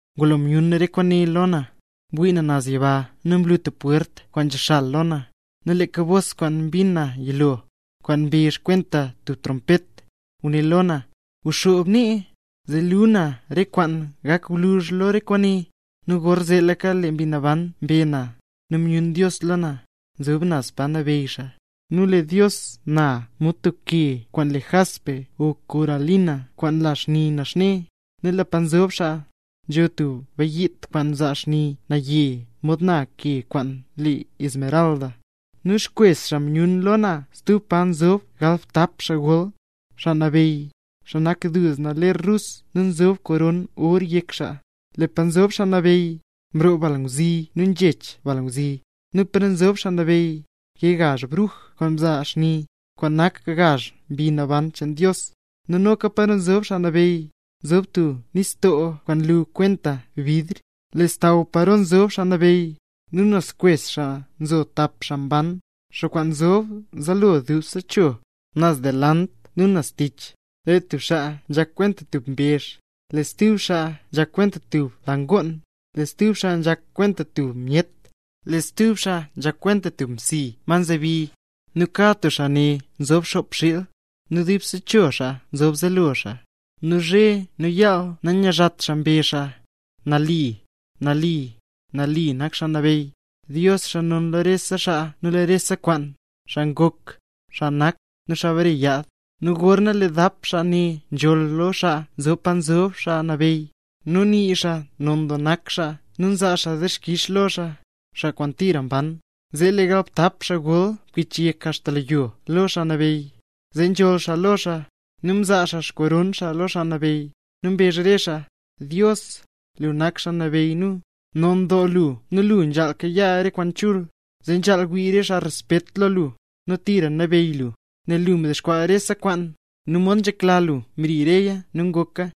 Ngulo myun re kwaane lo na, mwii na naz yiba nu mlu tub pwert kwaan nzexal lo na; nu leeka bos kwaan mbin na yilo, kwaan mbezh kwenta tub trompet, nguné lo na: —Guxoob nee, zee luu na re kwaan gak gwluzh lo re kwaane. Nu gorzeetlaka lee Mbi Naban mbe na, nu myun Dios lo na, nzob naz pa nabeyy xaa. Nu lee Dios na mod tub ke kwaan le jaspe o kornalina kwaan nla xni naxne, nu lee pa nzob xaa, nzo tub bayiit kwaan nzaa xni naye mod na ke kwaan le esmeralda. Nu xkwes xaa myun lo na stub pa nzob galbtap xaa gol, xaa nabeyy. Xaa nak duzna ler rus nu nzob koron or yek xaa. Lee pa nzob Xaa Nabeyy, nroo balngwzi nu nzhech balngwzi. Nu paro nzob Xaa Nabeyy, nkee gazh bruj kwaan nzaa xni, kwaan nak gazh mbi naban cheen Dios. Nu noka paro nzob Xaa Nabeyy, nzho tub nistoo kwaan nlu kwenta bidr. Lee xsaww paro nzob Xaa Nabeyy, nu naz xkwes xaa nzo tap xaa mban, xaa kwaan nzob zaalo dubse cho, naz delant nu naz tich. Lee tub xaa nzhak kwenta tub mbezh, lee stub xaa nzhak kwenta tub la ngoon, lee stub xaa nzhak kwenta tub myet, lee stub xaa nzhak kwenta tub msi ma nzhazebi. Nu kad tub xaa ne nzob xop xiil, nu dubse cho xaa nzob zaalo xaa. Nu zhe nu yaal nanyizhat xaa mbezh xaa: ¡Nali, nali, nali nak Xaa Nabeyy, Dios, xaa non lo rese xaa nu lo rese kwaan, xaa ngok, nu xaa nak, nu xaa bare yaad! Nu gorna lee dap xaa ne nzholl lo xaa nzob pa nzob Xaa Nabeyy, nu nii xaa non doo nak xaa nu nzaa dixkix xaa lo xaa, xaa kwaan tira mban, zee lee galbtap xaa gol nkichyek axta lo yo lo Xaa Nabeyy, zee nzholl xaa lo xaa, nu nzaa xaa xkoron xaa lo Xaa Nabeyy. Nu mbezh re xaa: Dios, lu nak Xaa Nabeyy nu. Non doo lu, nu lu nzhaal kayaa re kwaan chul, zee nzhaal wii re xaa respet lo lu, nu tira nabeyy lu, nel lu mdexkwaa rese kwaan; nu mod nzhekla lu mri reya nu ngoka.